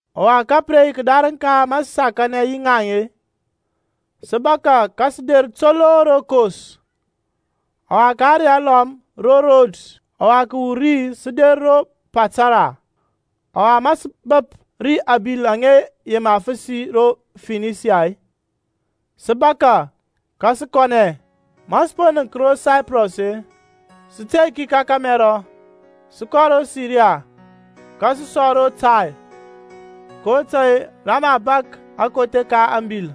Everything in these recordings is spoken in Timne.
Ɔwa ka pə re yi kədarəŋ ka ma sə sakanɛ yi ŋaŋ-e, sə bȧkȧ ka sə der toloŋ ro Kos, ɔwa ka ȧŋrey alɔm ro Rods, ɔwa kəwur ri sə der ro Patara. Ɔwa ma sə bəp ri abil aŋa yema fəsi ro Finisia-e, sə bȧkȧ ka sə kɔnɛ. Ma sə po nənk ro Saiprɔs-e, sə tey ki ka kȧmɛrɔ, sə kɔ ro Siria, ka sə sɔ ro Tair; kotȧy-e rə mə a bȧk akothe ka ȧŋbil.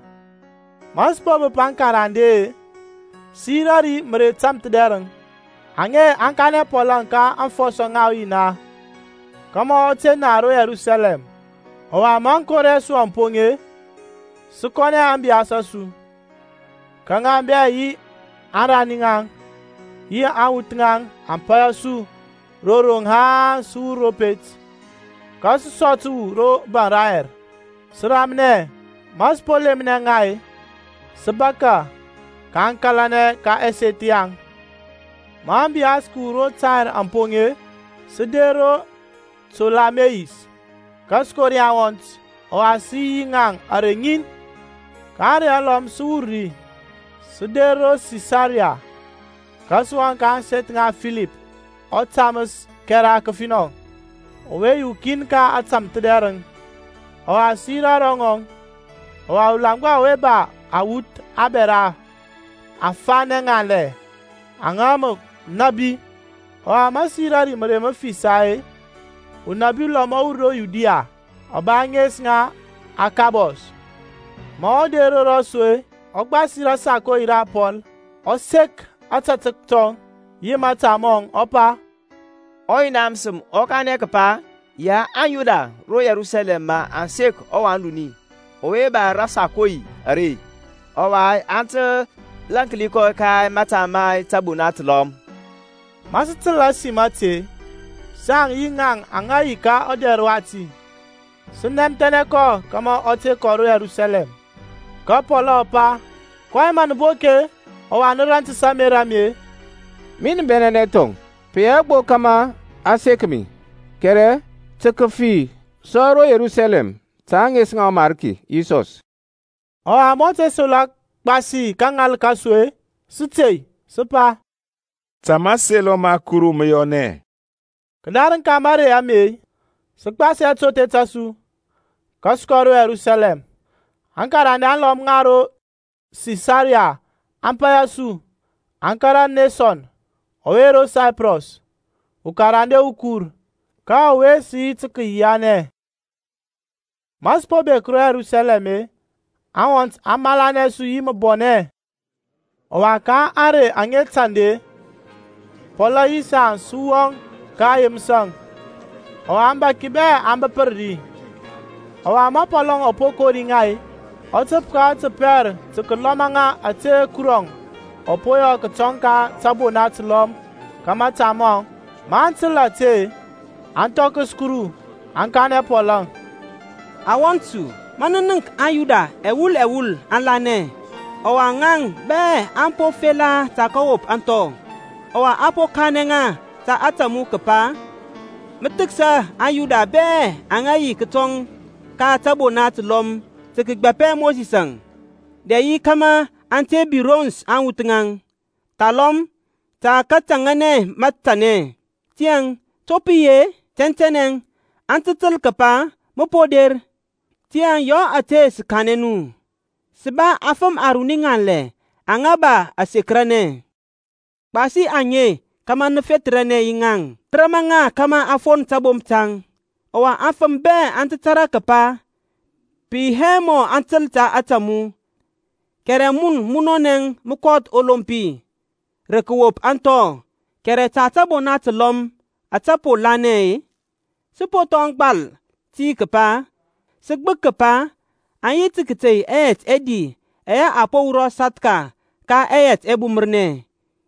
Ma sə po bəp aŋkarande-e, sə yirȧ ri mərey tȧmthədɛrəŋ. Aŋe aŋ kanɛ Pɔlȧŋ ka aŋfɔsɔ ŋa ɔYina kȧmȧ ɔ te na ro Yerusalɛm. Ɔwa ma aŋkori a su aŋ poŋ-e, sə kɔnɛ ȧŋbiyas a su, ka ŋa bɛ yi aŋrani ŋaŋ yi aŋwuth ŋaŋ aŋ paya su ro roŋ haŋ sə wur ro pet. Ka sə sɔ təwu ro baŋ dayɛr, sə ramnɛ. Ma sə po lemnɛ ŋa-e, sə bȧkȧ, kaŋ kȧlanɛ ka ɛseth yaŋ. Ma ȧŋbiyas kəwur ro Tair aŋ poŋ-e, sə der ro Tolameis, ka sə kori aŋwɔnt, ɔwa sə yi yi ŋaŋ ȧrey ŋin. Ka ȧŋrey alɔm sə wur ri, sə der ro Sisaria, ka sə wɔŋ ka ȧŋseth ŋa Filip ɔtaməs ȧkɛra kəfinɔ ɔwe yi ukin ka antamthədɛrəŋ. Ɔwa sə yirȧ ro ŋɔŋ. Ɔwa ɔlaŋgba ɔwe ɔ ba awuth abɛra afanɛ ŋanlɛ aŋa mə nȧbi. Ɔwa ma sə yirȧ ri mərey məfisa-e, unabi ulɔm ɔ wur ro Yudia, ɔ ba ȧŋes ŋa Akabɔs. Ma ɔ der ro rɔsu-e, ɔ gbasi rasakoi ra Pɔlȧŋ, ɔ sek ȧtȧtək tɔŋ yi mȧta mɔŋ, ɔ pa, ɔYina məsəm ɔ kanɛ kəpa, ya aŋYuda ro Yerusalɛm mə aŋ sek ɔwan duni ɔwe ba rasakoi are, ɔwa aŋ tə lȧnki kɔ ka mȧta ma tȧbona təlɔm. Ma sə təl ȧsim ȧte-e, saŋ yi ŋaŋ aŋa yi ka ɔdɛr wati, sə nɛmthɛnɛ kɔ kȧmȧ ɔ te kɔ ro Yerusalɛm. Ka Pɔlȧŋ ɔ pa, kɔyɛŋ mə nə bok-e, ɔwa nə rantəs ȧŋmerȧ a mi-e? Min bɛnɛnɛ thɔŋ, pə yi hɛ gbo kȧmȧ a sek mi, kɛrɛ tə kəfi sɔ ro Yerusalɛm ta ȧŋes ŋa ɔMarki Yisɔs. Ɔwa ma ɔ te selɔ gbasi kəŋal ka su-e, sə tey, sə pa, Ta mȧselɔ ma Kuru mə yɔnɛ. Kədarəŋ ka marey ame-e, sə gbasi atothe ta su, ka sə kɔ ro Yerusalɛm. Akarande alɔm ŋa ro Sisaria aŋ paya su, aŋ kȧrȧ Neson ɔwe ro Saiprɔs, ukarande ukur, ka ɔwe sə yi tə kəyianɛ. Ma sə po bek ro Yerusalɛm-e, aŋwɔnt aŋ malanɛ su yi məbɔnɛ. Ɔwa ka ȧŋrey aŋa tanda-e, Pɔlȧŋ yi saŋ sə wɔŋ ka Yeməsȧŋ. Ɔwa aŋbȧki bɛ aŋ bəpər ri. Ɔwa ma Pɔlȧŋ ɔ po kori ŋa-e, ɔ təp ka ɔtəpɛr tə kəlɔma ŋa ȧtȧ Kurɔŋ ɔ po yɔ kətɔŋ ka tȧbona təlɔm ka mȧta mɔŋ. Maŋ təl ȧte-e, aŋ thɔkəs Kuru, aŋ kanɛ Pɔlȧŋ, Wɔnt su, mə nənk ma aŋYuda ɛwul ɛwul aŋ lanɛ. Ɔwa ŋaŋ bɛ aŋ ba afela tə kəwop ȧŋthɔ. Ɔwa a po kanɛ ŋa ta ȧtȧ mu kəpa mə thəksa aŋYuda bɛ aŋa yi kətɔŋ ka tȧbona təlɔm tə kəgbȧpɛ Mosisȧŋ, dɛ yi kȧmȧ aŋ te birons aŋwuth ŋaŋ, thalɔm tə kətȧŋȧnɛ matanɛ. Tiyȧŋ to pə yi-e? Tɛntɛnɛ aŋ tə təl kəpa mə po der. Tiyȧŋ yɔ ȧte ȧtȧ sə kanɛ mu; sə ba afəm aruni ŋanlɛ aŋa ba asekəranɛ. Gbasi aŋe kȧmȧ mə fethərnɛ yi ŋaŋ, mə rama ŋa kȧmȧ aŋ fon tabomp taŋ. Ɔwa aŋfəm bɛ aŋ tə tȧrȧ kəpa pə yi hɛ mɔ aŋ təl ta ȧtȧ mu, kɛrɛ mun munɔnɛ mə kɔth ɔlompi, rə kəwop ȧŋthɔ. Kɛrɛ ta tȧbona təlɔm ȧtȧ po lanɛ-e, sə po thɔŋ gbal ti kəpa sə gbək kəpa aŋ yi tə kətei ɛyɛt ɛdi ɛyɛ a po wurɔ sathka ka ɛyɛt ɛbumərnɛ,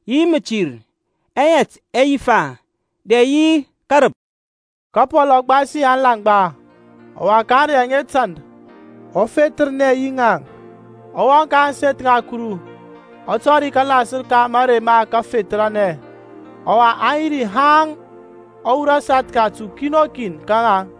yi mətir, ɛyɛt ɛyifa, dɛ yi kərəp. Ka Pɔl ɔ gbasi aŋlaŋgba, ɔwa ka ȧŋrey aŋa tanda, ɔ fethərnɛ yi ŋaŋ, ɔ wɔŋ ka ȧŋseth ŋa Kuru, ɔ tɔri kalasər ka marey ma kafethərnɛ, ɔwa aŋ yi ri haŋ ɔ wurɔ sathka ta ukin o kin ka ŋaŋ.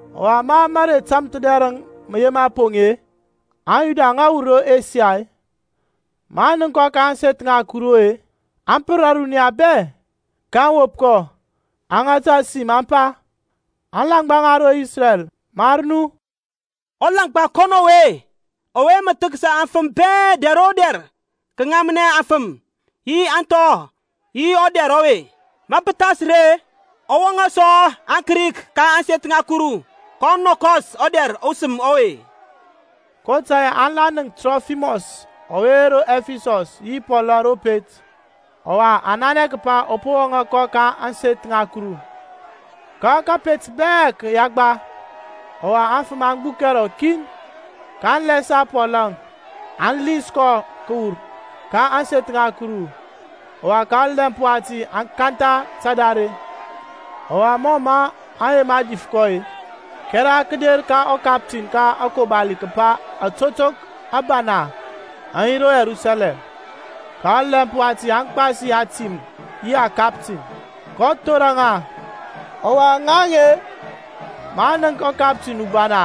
Ɔwa ma marey tȧmthədɛrəŋ mə yema poŋ-e, aŋYuda aŋa wur ro Asia, maŋ nənk kɔ ka ȧŋseth ŋa Kuru-e, aŋ pər ȧruniya bɛ, kaŋ wop kɔ, aŋ ŋata sim aŋ pa, Alaŋgba ŋa ro Isrɛl, mar nu. Ɔlaŋgba kɔnɔ ɔwe ɔwe mə thəksa aŋfəm bɛ dɛr o dɛr kəŋamnɛ aŋfəm, yi ȧŋthɔ yi ɔdɛr ɔwe. Ma pə thas ri-e, ɔ wɔŋȧ sɔ aŋKrik ka ȧŋseth ŋa Kuru, kɔ nɔkɔs ɔdɛr ɔsəm ɔwe. (kotȧy-e aŋ la nənk Trofimɔs ɔwe ro Ɛfisɔs yi Pɔlȧŋ ro pet, ɔwa aŋ nanɛ kəpa ɔ po wɔŋȧ kɔ ka ȧŋseth ŋa Kuru). Ka kȧpet bɛ kə yagba, ɔwa aŋfəm aŋ gbukɛ rɔkin. Kaŋ lɛsa Pɔlȧŋ, aŋ lins kɔ kəwur ka ȧŋseth ŋa Kuru, ɔwa ka ɔlɛmp wati aŋ kantha tadare. Ɔwa mɔ mə aŋ yema dif kɔ-e, kɛra kə der ka ɔkaptin ka akobali kəpa atotok abana aŋ yi ro Yerusalɛm. Ka ɔlɛmp wati ɔ gbasi atim yi akaptin, kɔ thorər ŋa. Ɔwa ŋaŋ-e, maŋ nənk ɔkaptin ubana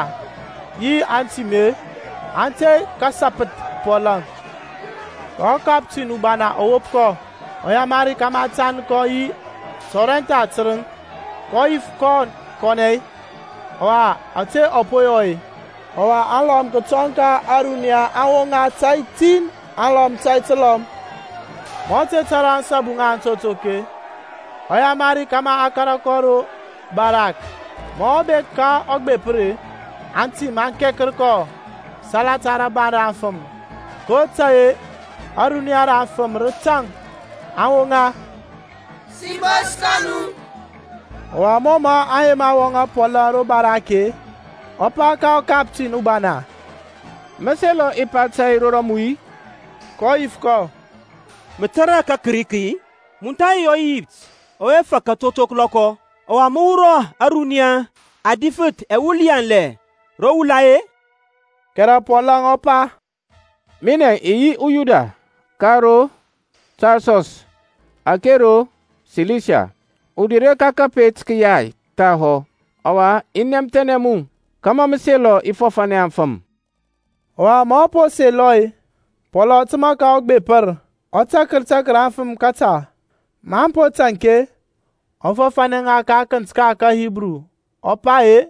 yi antim-e, aŋ tey kəsapəth Pɔlȧŋ. Ka ɔkaptin ubana ɔ wop kɔ, ɔ yamari kȧmȧ a tand kɔ yi tɔrɛntha tərəŋ; kɔ yif kɔn kanɛ-e, ɔwa ȧtȧ ɔ po yɔ-e? Ɔwa alɔm kətɔŋ ka ȧruniya aŋ woŋa tȧy tin, alɔm tȧy təlɔm. Ma ɔ te tȧrȧ ȧŋsabu ŋa antotok-e, ɔ yamari kȧmȧ a kȧrȧ kɔ ro barak. Ma ɔ bek ka ɔgbepər-e, antim aŋ kɛkər kɔ salata rabaŋ ra aŋfəm, kotȧy-e ȧruniya ra aŋfəm rə tȧŋ, aŋ woŋa, Sibos kɔ nu. Ɔwa mɔ mə a yema wɔŋȧ Pɔlȧŋ ro barak-e, ɔ pa ka ɔkaptin ubana, Mə selɔ i pa tȧy ro mu-i? kɔ yif kɔ, Mə tȧrȧ kaKrik-i? Mun tha yi ɔEyipt ɔwe fak atotok ȧŋlɔkɔ, ɔwa mə wurɔ ȧruniya adifəth ɛwul yanlɛ ro wula-e? Kɛrɛ Pɔlȧŋ ɔ pa, Minɛ i yi uYuda ka ro Tarsɔs ȧke ro Silisia, udure ka kəpet kəyay thahɔ. Ɔwa i nɛmthɛnɛ mu kȧmȧ mə selɔ i fɔfȧnɛ aŋfəm. Ɔwa ma ɔ po selɔ-e, Pɔlȧŋ ɔ təmȧ ka ɔgbepər, ɔ tak takər aŋfəm kəta. Maŋ po taŋk-e, ɔ fɔfȧnɛ ŋa ka akənt ka kaHibru, ɔ pa ye,